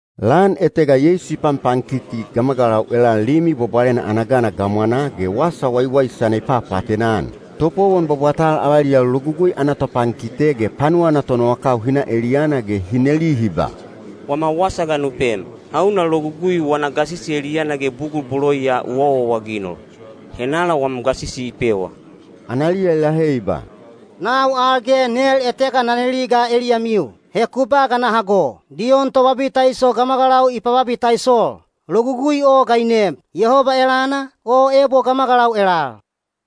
Lan etega Yeisu i panpankiti gamagalau elal Limi Bwabwalena ana gana gamwanaa ge wasa waiwaisana i papaatena-an. Topowon bwabwatal avaliyau Logugui ana topankite ge panuwa ana tonowakau hi na eliyana ge hi neli hi ba, “Wama wasa ga nu pem. Hauna logugui wana gasisi eliyana ge bugul bolo ya u awaawaginol? Henala wam gasisi i pewa?” Analiya i lahe i ba, “Nau al ge nel etega na neli ga eliyamiu. He ku ba ga na hago. Diyon Tobabitaiso gamagalau i pababitaisol. Logugui o ga i neem? Yehoba elana, o ebo gamagalau elal?”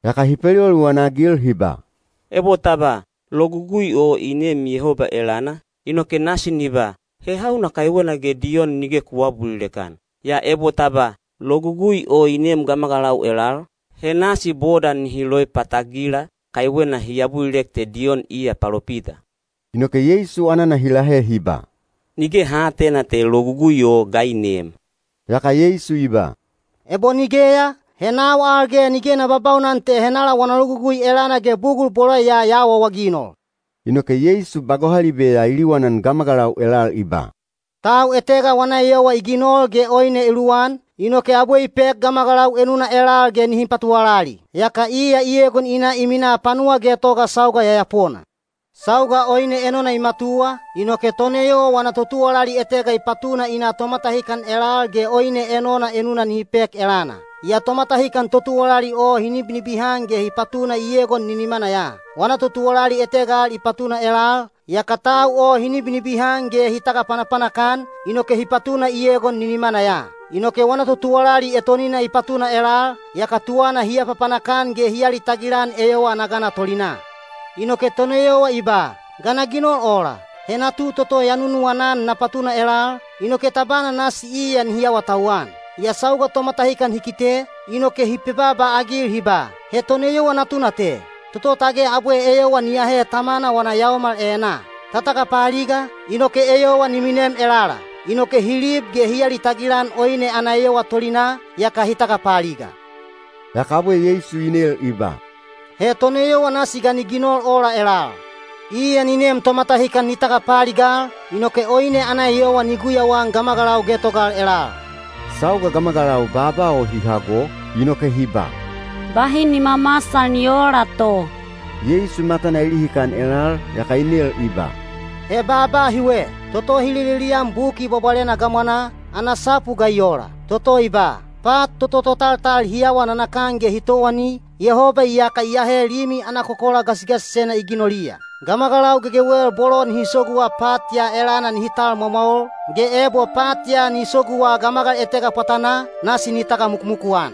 Yaka hi peliwaliwan-agil hi ba, “Ebo ta ba, ‘Logugui o i neem Yehoba elana,’ inoke nasi ni ba, ‘He hauna kaiwena ge Diyon nige ku aabulilek-an?’ Yaa ebo ta ba, ‘Logugui o i neem gamagalau elal,’ he nasi boda nihi loipatagila, kaiwena hi abulilek te Diyon iya palopita.” Inoke Yeisu anana hi lahe hi ba, “Nige ha aatena te logugui o ga i neem.” Yaka Yeisu i ba, “Ebo nigeya, he nau al ge nige na babaunan te henala wana logugui elana ge bugul bolo ya ya awaawaginol.” Inoke Yeisu ba gohalibe ya i liwanan gamagalau elal i ba, “Tau etega wana eyowa i ginol ge oine i luwan, inoke abwe i pek gamagalau enuna elal ge nihi patuwalali. Yaka iya i egon i na i minaa panuwa getoga sauga yayapona. Sauga oine enona i matuwa, inoke toneyowa wana totuwalali etega i patuna i na tomatahikan elal ge oine enona enuna nihi pek elana. Yaa tomatahikan totuwalali o hi nibinibihan ge hi patuna i egon ninimana ya. Wana totuwalali etega al i patuna elal, yaka tau o hi nibinibihan ge hi tagapanapanak-an, inoke hi patuna i egon ninimana ya. Inoke wana totuwalali etonina i patuna elal, yaka tuwana hi apapanak-an ge hi alitagil-an eyowa ana gana tolinaa. Inoke toneyowa i ba, ‘Ga na ginol ola? He natu toto ya nunuwana-an na patuna elal, inoke tabana nasi iya nihi awatauwan!’ Yaa sauga tomatahikan hi kite, inoke hi pebaaba-agil hi ba, ‘He toneyowa natuna te, toto tage abwe eyowa ni ahe tamana wana yaomal enaa. Ta tagapaaliga, inoke eyowa ni minem elala.’ Inoke hi lib ge hi alitagil-an oine ana eyowa tolinaa, yaka hi tagapaaliga.” Yaka abwe Yeisu i nel i ba, “He toneyowa nasi ga ni ginol ola elal? Iya ni nem tomatahikan ni tagapaaligal, inoke oine ana eyowa ni guyauan gamagalau getogal elal.” Sauga gamagalau baaba o hi hago, inoke hi ba, “Bahi ni mamasal ni oola to!” Yeisu matana i lihikan elal, yaka i nel i ba, “He baaba hiwe, toto hi lelelian Buki Bwabwalena gamwanaa, ana sapu ga i ola? Toto i ba, ‘Pat toto totaltal hi awa nanakan ge hi towani, Yehoba iyaka i ahe limi ana kokola gasigasisena i ginoliya.’ Gamagalau gegewel bolo nihi soguwa pat ya elana nihi tal mwamwaol, ge ebo pat ya ni soguwa gamagal etega pwatanaa, nasi ni tagamukumuku-an.”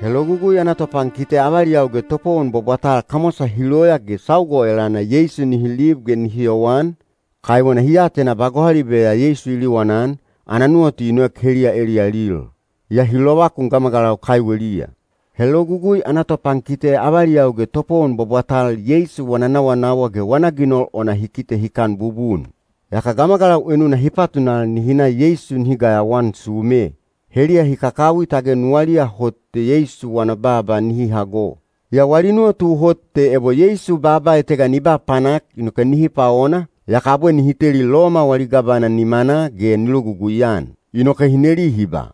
He Logugui ana topankite avaliyau ge topowon bwabwatal kamwasa hi loya ge sauga o elana Yeisu nihi lib ge nihi yowan, kaiwena hi atena ba gohalibe ya Yeisu i liwanan, ana nuwatu i noek heliya eliyalil. Yaa hi lovakun gamagalau kaiweliya. He Logugui ana topankite avaliyau ge topowon bwabwatal Yeisu wana nawanawa ge wana ginol ona hi kite hikan bubun. Yaka gamagalau enuna hi patunal nihi na Yeisu nihi gayawaan sume. Heliya hi kakawi tage nuwaliya hot te Yeisu wana baaba nihi hago. Yaa wali nuwatu hot te ebo Yeisu baaba etega ni ba panak inoke nihi paona, yaka abwe nihi teli Loma wali gavana nimanaa ge ni logugui-an. Inoke hi neli hi ba,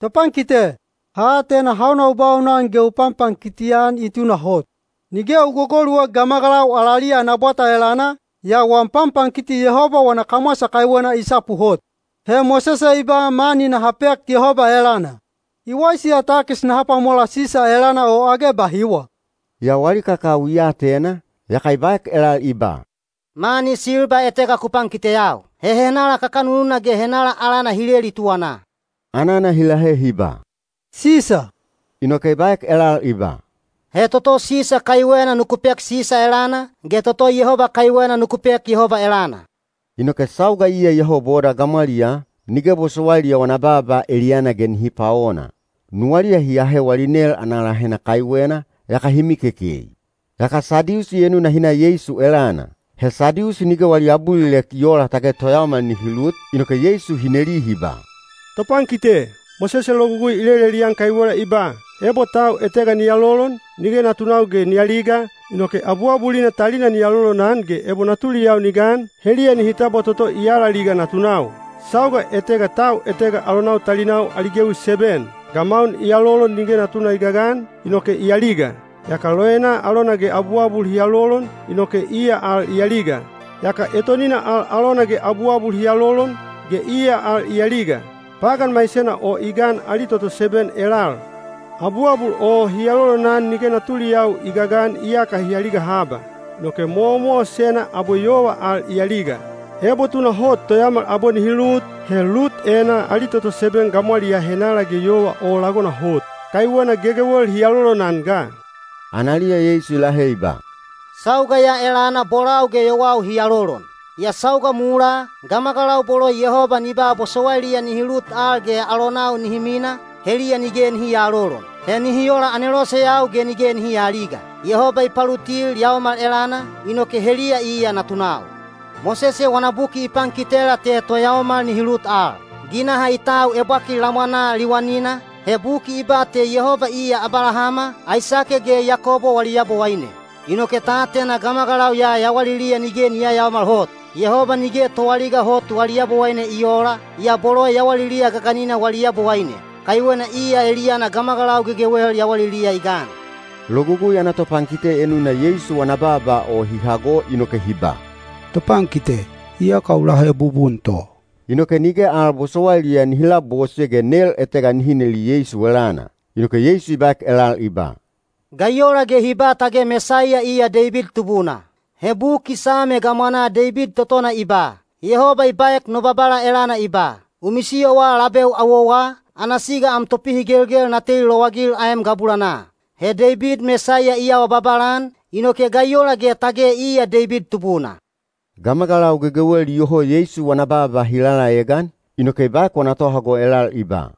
“Topankite, ha atena hauna u baunan ge u panpankiti-an i tunahot. Nige u golugoluek gamagalau alaliya ana bwata elana, yaa wam panpankiti Yehoba wana kamwasa kaiwena i sapu hot. He Mosese i ba mani naha pek Yehoba elana. I waisi ya takis naha pwamola Sisa elana o age bahiwa?” Yaa wali kakawi i atena, yaka i baek elal i ba, “Mani silba etega ku pankiteyau. He henala kakanununa ge henala alana hi leli tuwanaa?” Anana hi lahe hi ba, “Sisa.” Inoke i baek elal i ba, “He toto Sisa kaiwena nuku pek Sisa elana, ge toto Yehoba kaiwena nuku pek Yehoba elana.” Inoke sauga iya iyoho boda gamwaliyaa, nige bosowailiya wana baaba eliyana ge nihi paona. Nuwaliya hi ahe wali nel ana lahena kaiwena, yaka hi mikekei. Yaka Sadiusi enuna hi na Yeisu elana. He Sadiusi nige wali abulilek i oola tage toyaomal nihi lut, inoke Yeisu hi neli hi ba, “Topankite, Mosese logugui i lelelian kaiwela i ba, ‘Ebo tau etega ni alolon, nige natunau ge ni aliga, inoke abuabulina talina ni alolonan ge ebo natuliyau ni gan, heliya nihi tabwa toto i alaliga natunau.’ Sauga etega tau etega alonau talinau ali gewi seben. Gamaun i alolon nige natuna i gagan, inoke i aliga. Yaka loena alona ge abuabul hi alolon, inoke iya al i aliga. Yaka etonina al alona ge abuabul hi alolon, ge iya al i aliga. Pagan maisena o i gan ali toto seben elal: abuabul o hi alolonan nige natuliyau i gagan iyaka hi aliga haba. Inoke mowamowasena abwe yova al i aliga. Ebo tunahot toyaomal abwe nihi lut, he lut enaa ali toto seben gamwaliyaa henala ge yova o lagona hot? Kaiwena gegewel hi alolonan ga.” Analiya Yeisu i lahe i ba, “Sauga ya elana bolau ge yowau hi alolon. Yaa sauga mulaa, gamagalau bolo Yehoba ni ba bosowailiya nihi lut al ge alonau nihi mina, heliya nige nihi aalolon. He nihi ola aneloseyau ge nige nihi aaliga. Yehoba i palutil yaomal elana, inoke heliya iya natunau. Mosese wana buki i pankitela te toyaomal nihi lut al. Ginaha i tau ebwakil lamwanaa liwanina, he buki i ba te Yehoba iya Abalahama, Aisake ge Yakobo wali Yabowaine. Inoke ta atena gamagalau ya yawaliliya nige i yayaomal hot. Yehoba nige toaliga hot wali Yabowaine i oola, yaa bolo yawaliliya gaganina wali Yabowaine. Kaiwena iya eliyana gamagalau gegewel yawaliliya i gan.” Logugui ana topankite enuna Yeisu wana baaba o hi hago inoke hi ba, “Topankite, iyaka u lahe bubun to.” Inoke nige al bosowailiya nihi labose ge nel etega nihi neli Yeisu elana. Inoke Yeisu i baek elal i ba, “Ga i ola ge hi ba tage Mesaiya iya Deibid tubuna? He Buki Same gamwanaa Deibid totona i ba, ‘Yehoba i baek no Babala elana i ba: U misiyowa labeu awowa, ana siga am topihigelgel na teli lowagil aem gabulanaa.’ He Deibid Mesaiya i awa babala-an, inoke ga i ola ge tage iya Deibid tubuna?” Gamagalau gegewel iyoho Yeisu wana baaba hi lalaegan, inoke i baek wana tohago elal i ba,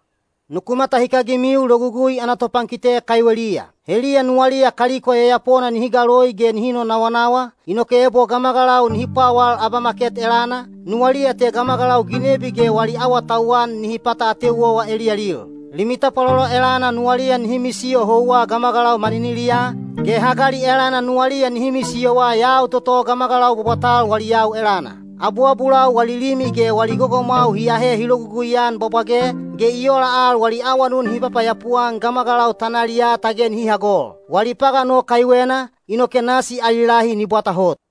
“Nuku matahikagimiu Logugui ana topankite kaiweliya. Heliya nuwaliya kaliko yayapona nihi galoi ge nihi nonawanawa, inoke ebo gamagalau nihi pwawal abamaket elana, nuwaliya te gamagalau ginebi ge wali awatauwan nihi pata ateu owa eliyalil. Limi tapwalolo elana nuwaliya nihi misiyo houwa gamagalau maniniliyaa, ge hagali elana nuwaliya nihi misiyowa yau toto gamagalau bwabwatal wali yau elana. Abuabulau wali limi ge wali gogomwau hi aahe hi lologugui-an bwabwage, ge i ola al wali awanun hi papayapu-an gamagalau tanaliyaa tage nihi hagol. Wali pagan o kaiwena, inoke nasi ali lahi ni bwata hot.”